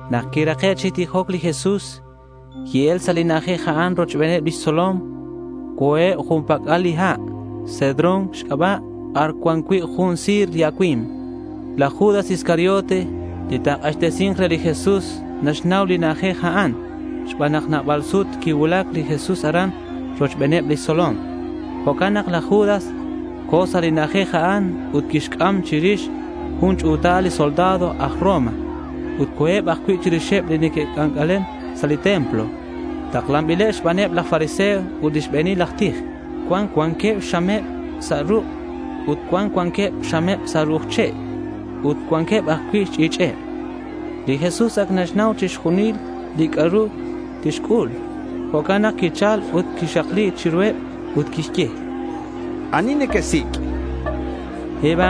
Nak quirake' chi tijoc li Jesús, qui-el sa' li na'ajej a'an rochbeneb lix tzolom. Co̱eb jun pac'al li ha' Cedrón xc'aba' bar cuan cui' jun si̱r li acui̱mk. Laj Judas Iscariote, li ta̱k'axtesi̱nk re li Jesús, naxnau li na'ajej a'an xban nak nabal sut quicuulac li Jesús aran rochbeneb lix tzolom. Jo'can nak laj Judas co̱ sa' li na'ajej a'an ut quixc'am chirix jun ch'u̱tal li soldado aj Roma. Ut co̱eb ajcui' chirixeb li neque'c'ac'alen sa' li templo. Taklanbileb xbaneb laj fariseo ut li xbe̱nil aj tij. Cuan cuanqueb xxameb sa' ruk' ut cuan cuanqueb xxameb sa' ru'uj che' ut cuanqueb ajcui' xch'i̱ch'eb. Li Jesús ac naxnau chixjunil li c'a'ru tixc'ul. Jo'can nak quichal ut quixakli chiruheb ut quixye: —¿Ani nequesic'? chan reheb.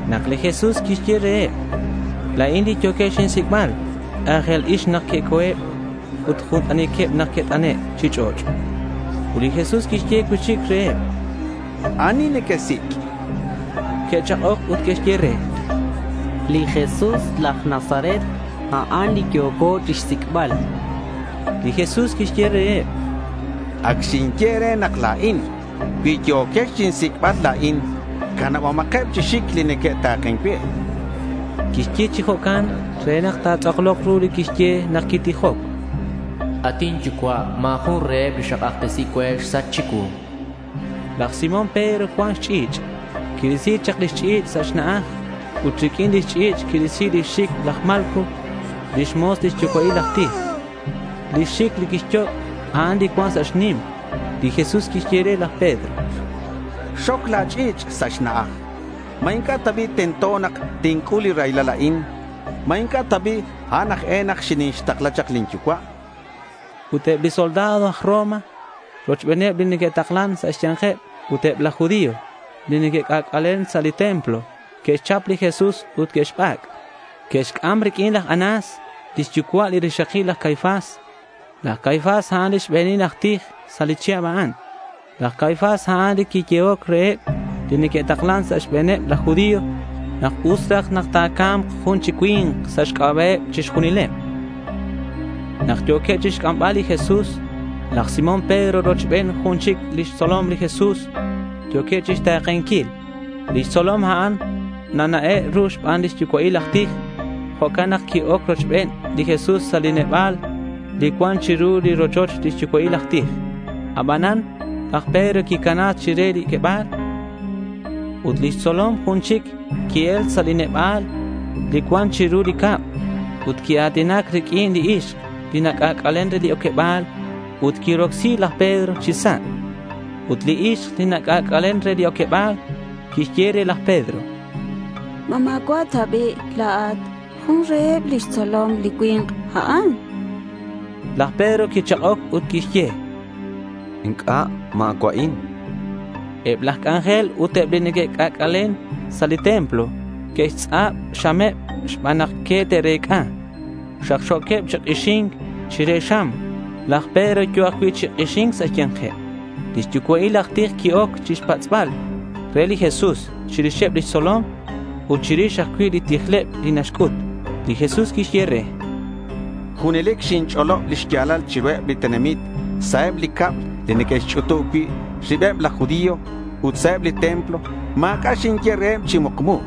Nak li Jesús quixye reheb, “La̱in li yo̱quex chinsic'bal”, k'a̱jel ix nak que'co̱eb ut jun t'aniqueb nak que't'ane' chi ch'och'. Ut li Jesús quixye cui'chic reheb: —¿Ani nequesic'? Que'chak'oc ut que'xye re: —Li Jesús laj Nazaret, a'an li yo̱co chixsic'bal.— Li Jesús quixye reheb: —Ac xinye e̱re nak la̱in. Cui yo̱quex chinsic'bal la̱in, canabomakeb chi xic li neque'ta̱ken cue, chan. Quixye chi jo'can re nak ta̱tz'aklok ru li quixye nak quitijoc: At inYucua', ma̱ jun reheb li cak'axtesiheb cue xsach chicuu. Laj Simón Pedro cuan xch'i̱ch'. Quirisi chak lix ch'i̱ch' sa' xna'aj. Ut riq'uin lix ch'i̱ch' quirisi lix xic laj Malco lix mo̱s li xyucua'il aj tij. Li xic li quixyoc', a'an li cuan sa' xnim. Li Jesús quixye re laj Pedro: —Xoc la̱ ch'i̱ch' sa' xna'aj. ¿Ma inc'a' ta bi' tento nak tinc'ul li raylal a'in? ¿Ma inc'a' ta bi' a'an aj e nak xinixtakla chak lin Yucua'? chan. Ut eb li soldado aj Roma rochben li nataklan sa' xbe̱neb ut eb laj judío li neque'c'ac'alen sa' li templo, que'xchap li Jesús ut que'xbac'. Que'xc'am riq'uin laj Anás lix yucua' li rixakil laj Caifás. Laj Caifás, a'an li xbe̱nil aj tij sa' li chihab a'an. Laj Caifás a'an li quiyehoc reheb li neque'taklan sa' xbe̱neb laj judío nak us raj nak ta̱ca̱mk jun chi cui̱nk sa' xc'aba'eb chixjunileb. Nak yo̱queb chixc'ambal li Jesús, laj Simón Pedro rochben jun chic lix tzolom li Jesús yo̱queb chixta̱kenquil. Li tzolom a'an nana'e' ru xban li xyucua'il aj tij. Jo'can nak qui-oc rochben li Jesús sa' li neba̱l li cuan chiru li rochoch li xyucua'il aj tij. Abanan laj Pedro quicana sa' be chire li oqueba̱l. Ut lix tzolom jun chic qui-el sa' li neba̱l li cuan chiru li cab ut quia̱tinac riq'uin li ixk li nac'ac'alen re li oqueba̱l. Ut quirocsi laj Pedro chi sa'. Ut li ixk, li nac'ac'alen re li oqueba̱l quixye re laj Pedro, —¿Ma ma̱cua' ta bi' la̱at jun reheb lix tzolom li cui̱nk a'an? chan re. Laj Pedro quichak'oc ut quixye: —Inc'a'. Ma̱cua'in.— Eb laj c'anjel ut eb li neque'c'ac'alen sa' li templo que'xtz'ab xxameb xban nak que te'rec'a. Xakxo̱queb chi k'ixi̱nc chire xam. Laj Pedro yo̱ ajcui' chi k'ixi̱nc sa' xya̱nkeb. Li xyucua'il aj tij qui-oc chixpatz'bal re li Jesús chirixeb lix tzolom ut chirix ajcui' li tijleb li naxc'ut. Li Jesús quixye re: —Junelic xinch'olob li xya̱lal chiruheb li tenamit sa' eb li cab li neque'xch'utub cui' ribeb laj judío ut sa' li templo. Ma̱c'a' xinye reheb chi mukmu.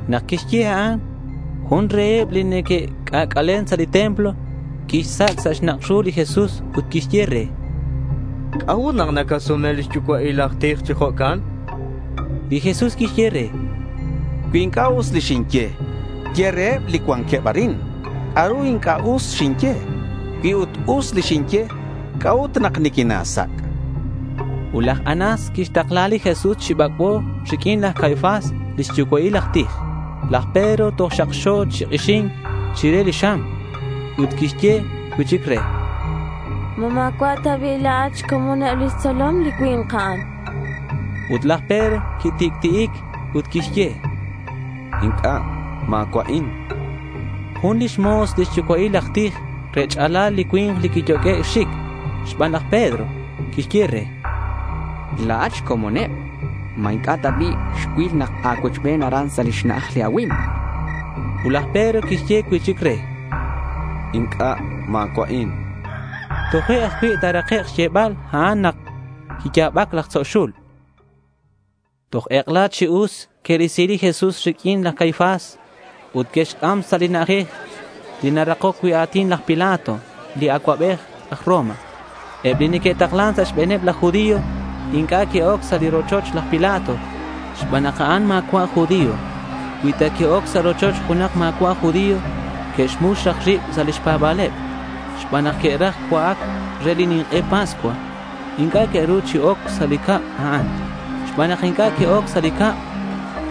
Nak quixye a'an, jun reheb li neque'c'ac'alen sa' li templo quixsac' sa' xnak' ru li Jesús ut quixye re: —¿C'a'ut nak nacasume li xyucua'il aj tij chi jo'can? chan re. Li Jesús quixye re: —Cui inc'a' us li xinye, ye reheb li cuanqueb arin c'a'ru inc'a' us xinye. Cui ut us li xinye, ¿c'a'ut nak niquina̱sac'? chan re. Ut laj Anás quixtakla li Jesús chi bac'bo riq'uin laj Caifás li xyucua'il aj tij. Laj Pedro toj xakxo chi k'ixi̱nc chire xam. Ut que'xye cui'chic re: —¿Ma ma̱cua' ta bi' la̱at xcomoneb lix tzolom li cui̱nk a'an? Ut laj Pedro quitic'ti'ic ut quixye: —Inc'a'. Ma̱cua'in.— Jun lix mo̱s li xyucua'il aj tij rech'alal li cui̱nk li quiyoq'ue' xxic xban laj Pedro, quixye re: —La̱at xcomoneb. ¿Ma inc'a' ta bi' xcuil nak a̱cuochben aran sa' li xna'aj li acui̱mk? chan. Ut laj Pedro quixye cui'chic re: —Inc'a'. Ma̱cua'in, chan. Toje' ajcui' ta̱rakek' xyebal a'an nak quiya̱bac laj tzo' xul. Toj ek'ela chi us que'risi li Jesús riq'uin laj Caifás ut que'xc'am sa' li na'ajej li narakoc cui' a̱tin laj Pilato li acuabej aj Roma. Eb li neque'taklan sa' xbe̱neb laj judío inc'a' que'oc sa' li rochoch laj Pilato xban nak a'an ma̱cua' aj judío. Cui ta que'oc sa' rochoch junak ma̱cua' aj judío, que'xmux raj rib sa' lix pa̱ba̱leb. Xban nak que'raj cua'ac re li nink'e Pascua, inc'a' que'ru chi oc sa' li cab a'an. Xban nak inc'a' que'oc sa' li cab,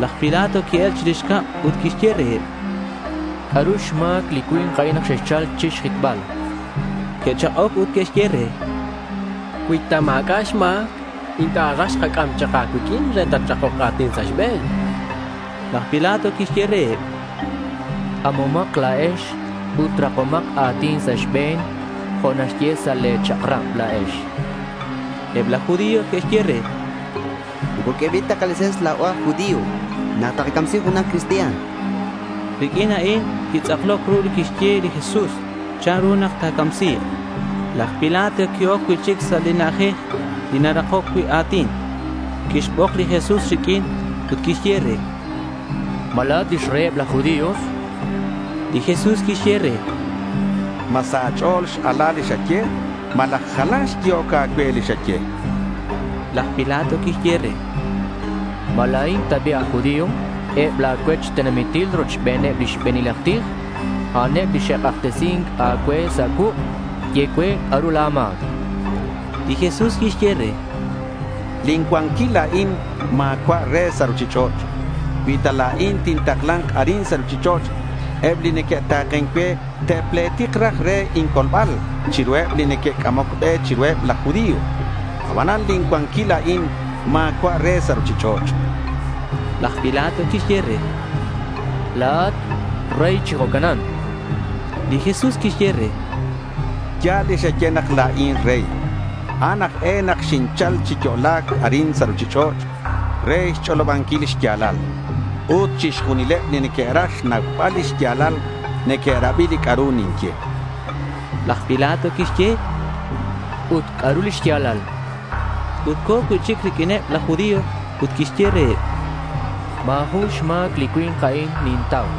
laj Pilato qui-el chirix cab ut quixye reheb: —¿C'a'ru xma̱c li cui̱nk a'in nak xexchal chixjitbal? chan reheb. Que'chak'oc ut que'xye re: —Cui ta ma̱c'a' xma̱c, inc'a' raj xkac'am chak a̱cuiq'uin re nak tatrakok a̱tin sa' xbe̱n, chanqueb. Laj Pilato quixye reheb: —C'amomak la̱ex ut rakomak a̱tin sa' xbe̱n jo' naxye sa' le̱ chak'rab la̱ex, chan. Eb laj judío que'xye re: —Moco q'uebil ta kalese̱ns la̱o aj judío nak takacamsi junak cristian, chanqueb. Riq'uin a'in quitz'akloc ru li quixye li Jesús chanru nak ta̱camsi̱k. Laj Pilato qui-oc cui'chic sa' li na'ajej li narakoc cui' a̱tin. Quixbok li Jesús riq'uin ut quixye re: —¿Ma la̱at lix reyeb laj judío? chan re. Li Jesús quixye re: —¿Ma sa' a̱ch'o̱l x-ala li xaye, malaj jalan xyehoc a̱cue li xaye? chan. Laj Pilato quixye re: —¿Ma la̱in ta bi' aj judío? Eb la̱ cuech tenamitil rochbeneb li xbe̱nil aj tij, a'aneb li xe'k'axtesin a̱cue sa' cuuk'. Ye cue c'a'ru a̱ma̱c, chan. Li Jesús quixye re: —Lin cuanquil la̱in ma̱cua' re sa' ruchich'och'. Cui ta la̱in tintakla̱nk arin sa' ruchich'och', eb li neque'ta̱ken cue te'pletik raj re incolbal chiruheb li neque'c'amoc be chiruheb laj judío. Abanan lin cuanquil la̱in ma̱cua' re sa' ruchich'och', chan. Laj Pilato quixye re: —La̱at rey chi jo'canan.— Li Jesús quixye re: —Ya̱l li xaye nak la̱in rey. A'an aj e nak quinchal chi yo'la̱c arin sa' ruchich'och' re xch'olobanquil li xya̱lal. Ut chixjunileb li neque'raj xnaubal li xya̱lal, neque'rabi li c'a'ru ninye, chan. Laj Pilato quixye: —Ut, ¿c'a'ru li xya̱lal?— Ut co̱ cui'chic riq'uineb laj judío ut quixye reheb: —Ma̱ jun xma̱c li cui̱nk a'in nintau.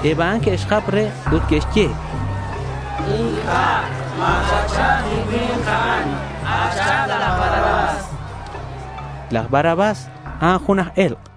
Eb a'an que'xjap re ut que'xye: —Inc'a'. Ma̱cuach'ab li cui̱nk a'an. Ach'ab laj Barrabás, chanqueb. Laj Barrabás, a'an jun aj e̱lk'.